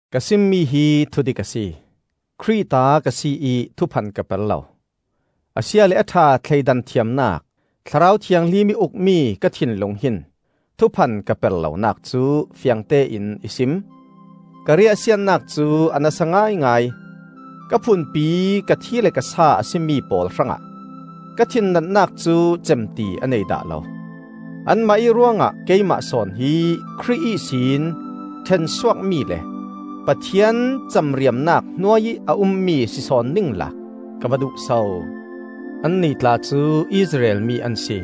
Ka simmi hi thudik a si. Khrih ta ka si ih thuphan ka per lo. A sia le a ṭha thleidan thiamnak, Thlarau Thianghlim ih ukmi ka thinlung hin thuphan ka per lonak cu fiangtein i sim. Ka riahsiatnak cu a nasa ngaingai; ka phunpi ka thi le ka sa a si mi pawl hrangah, ka thinnatnak cu cem ti a nei dah lo. Anmah ih ruangah keimah sawn hi Khrih ihsin ṭhensuakmi le Pathian camriamnak hnuai ih a ummi si sawn ningla ka va duh so! Annih tla cu Israel mi an si;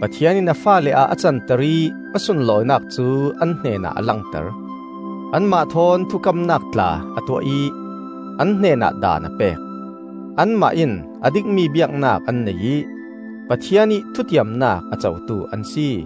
Pathian in a faale ah a canter ih a sunlawinak cu an hnenah a langter; anmah thawn thukamnak tla a tuah ih an hnenah Daan a pek; anmah in a dikmi biaknak an nei ih Pathian ih thutiamnak a cotu an si.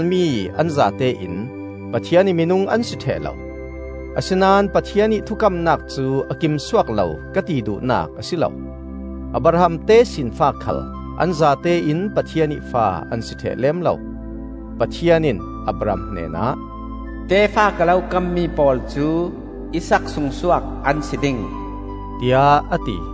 Israel mi an zatein Pathian ih minung an si ṭheh lo; asinain Pathian ih thukamnak cu a kim suak lo ka ti duhnak a si lo. Abraham tesinfa khal an zatein Pathian ih fa an si ṭheh lem lo. Pathian in Abraham hnenah, “Tefa ka lo kammi pawl cu Isaak sungsuak an si ding,” tiah a ti.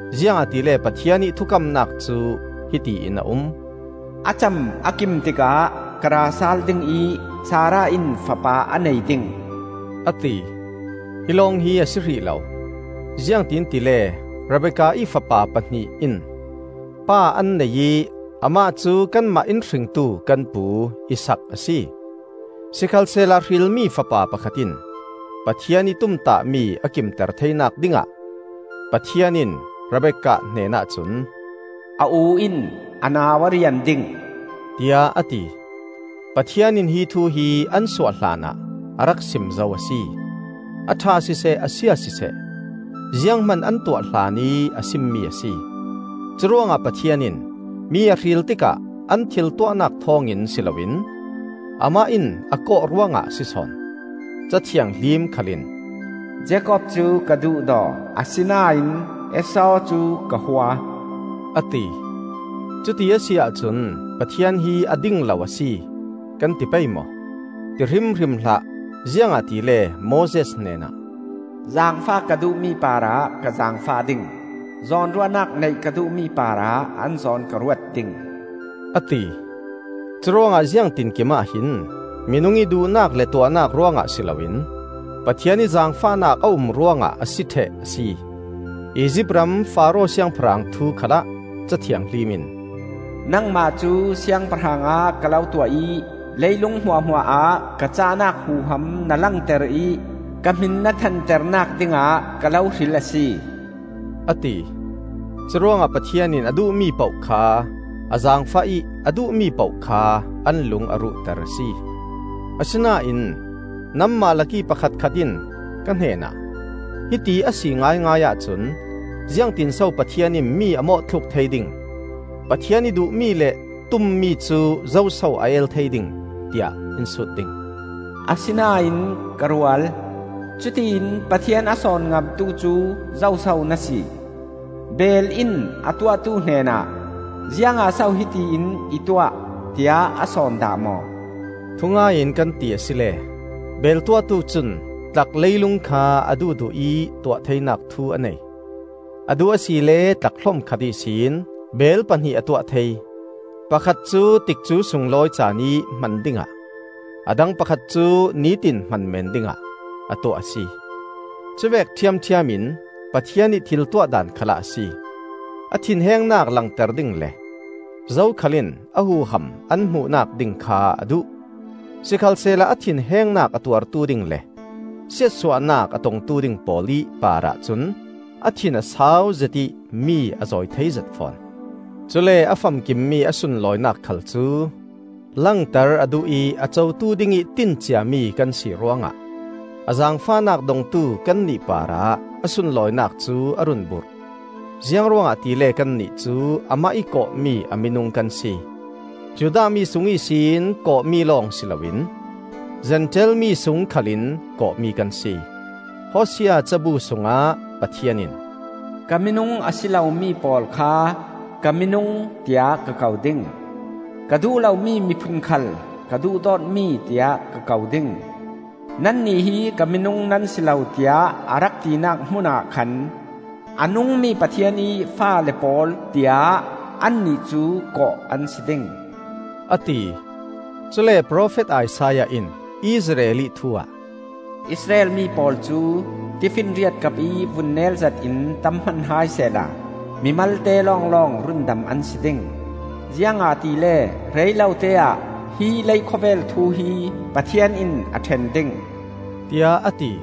Ziangahtile Pathian ih thukamnak cu hiti in a um: “A cam a kim tikah ka ra sal ding ih Sarah in fapa a nei ding,” a ti. Hi lawng hi a si hrih lo. Ziangtin tile Rebekka ih fapa pahnih in pa an nei ih amah cu kanmah in hringtu kan pu Isaak a si. Sikhalsehla hrilmi fapa pakhat in Pathian ih tumtahmi a kimter theinak dingah Pathian in Rebekah hnen ahcun, “A u in a nau a rian ding,” tiah a ti. Pathian in hi thu hi an suah hlanah a rak sim zo a si; a ṭha siseh, a sia siseh, zianghman an tuah hlanih a simmi a si. Curuangah Pathian in mi a hril tikah an thil tuahnak thawngin si lo in Amah in a kawh ruangah a si sawn. Ca Thianghlim khal in, “Jakob cu ka duhdaw, asinain Esau cu ka hua,” a ti. Cuti a si ahcun Pathian hi a ding lo a si, kan ti pei maw? Ti hrimhrim hlah! Ziangahtile Moses hnenah, “Zaangfah ka duhmi parah ka zaangfah ding; zawnruahnak neih ka duhmi parah an zawn ka ruat ding,” a ti. Curuangah ziangtinkim ahhin minung ih duhnak le tuahnak ruangah si loin Pathian ih zaangfahnak a um ruangah a si ṭheh a si. Izipt ram Faro siangpahrang thu khalah Ca Thianghlim in, “Nangmah cu siangpahrang ah ka lo tuah ih leilung hmuahhmuah ah ka cahnak huham na langter ih ka hmin na thanternak dingah ka lo hril a si,” a ti. Curuangah Pathian in a duhmi poh kha a zaangfah ih a duhmi poh kha an lung a ruhter a si. Asinain nanmah lakih pakhatkhat in ka hnenah, “Hiti a si ngaingai ahcun, ziangtinso Pathian in mi a mawhthluk thei ding? Pathian ih duhmi le tummi cu zoso a el thei ding?” tiah in sut ding. Asinain, ka rual, cutiin Pathian a sawn ngamtu cu zoso na si? Beel in a tuahtu hnenah, “Ziangah so hiti in i tuah?” tiah a sawn dah maw? Thungai in kan ti asile beel tuahtu cun tlak leilung kha a duhduh ih tuah theinak thu a nei: a duh asile tlak hlom khat ihsin beel pahnih a tuah thei; pakhat cu tikcu sunglawi caan ih hman dingah, a dang pakhat cu nitin hman men dingah, a tuah a si. Cuvek ṭhiamṭhiam in Pathian ih thil tuahdan khal ah a si. A thinhengnak langter ding le zokhal in a huham an hmuhnak ding kha a duh. Sikhalsehla a thinhengnak a tuartu ding le siatsuahnak a tongtu ding pawl ih parah cun a thin a sauzet ih mi a zawi theizet fawn. Cule a famkimmi a sunlawinak khal cu langter a duh ih a cotu dingih tin ciami kan si ruangah a zaangfahnak dongtu kannih parah a sunlawinak cu a run burh. Ziang ruangah tile kannih cu amah ih kawhmi a minung kan si; Judah mi sung ihsin kawhmi lawng si lo in Zentail mi sung khalin kawhmi kan si. Hosea cabu sungah Pathian in, “Ka minung a si lomi pawl kha ‘Ka minung,’ tiah ka ko ding. Ka duh lomi miphun khal ‘Ka duhdawtmi,’ tiah ka ko ding. ‘Nannih hi ka minung nan si lo tiah a rak tinak hmunah khan, ‘A nungmi Pathian ih faale pawl’ tiah annih cu kawh an si ding,” a ti. Cule profet Isaiah in Israel ih thu ah, “Israel mi pawl cu tifinriat kapih vunnel zat in tam hman hai sehla mi malte lawnglawng rundam an si ding; ziangahtile rei lote-ah hi leikhawvel thu hi Pathian in a ṭhen ding,” tiah a ti.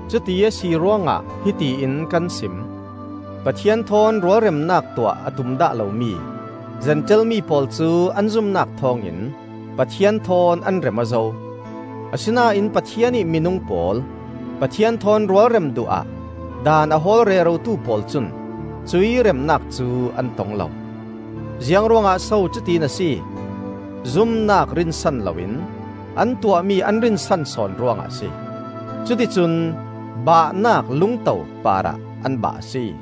Cuti a si ruangah, hiti in kan sim: Pathian thawn rualremnak tuah a tum dah lomi Zentail mi pawl cu an zumnak thawngin Pathian thawn an rem aw zo. Asinain Pathian ih minung pawl, Pathian thawn rualrem duh ah daan a hawl rerotu pawl cun cuih remnak cu an tong lo. Ziangruangah so cutin a si? Zumnak rinsan loin an tuahmi an rinsan sawn ruangah a si. Cuti cun, “Bahnak lungto,” parah an bah a si.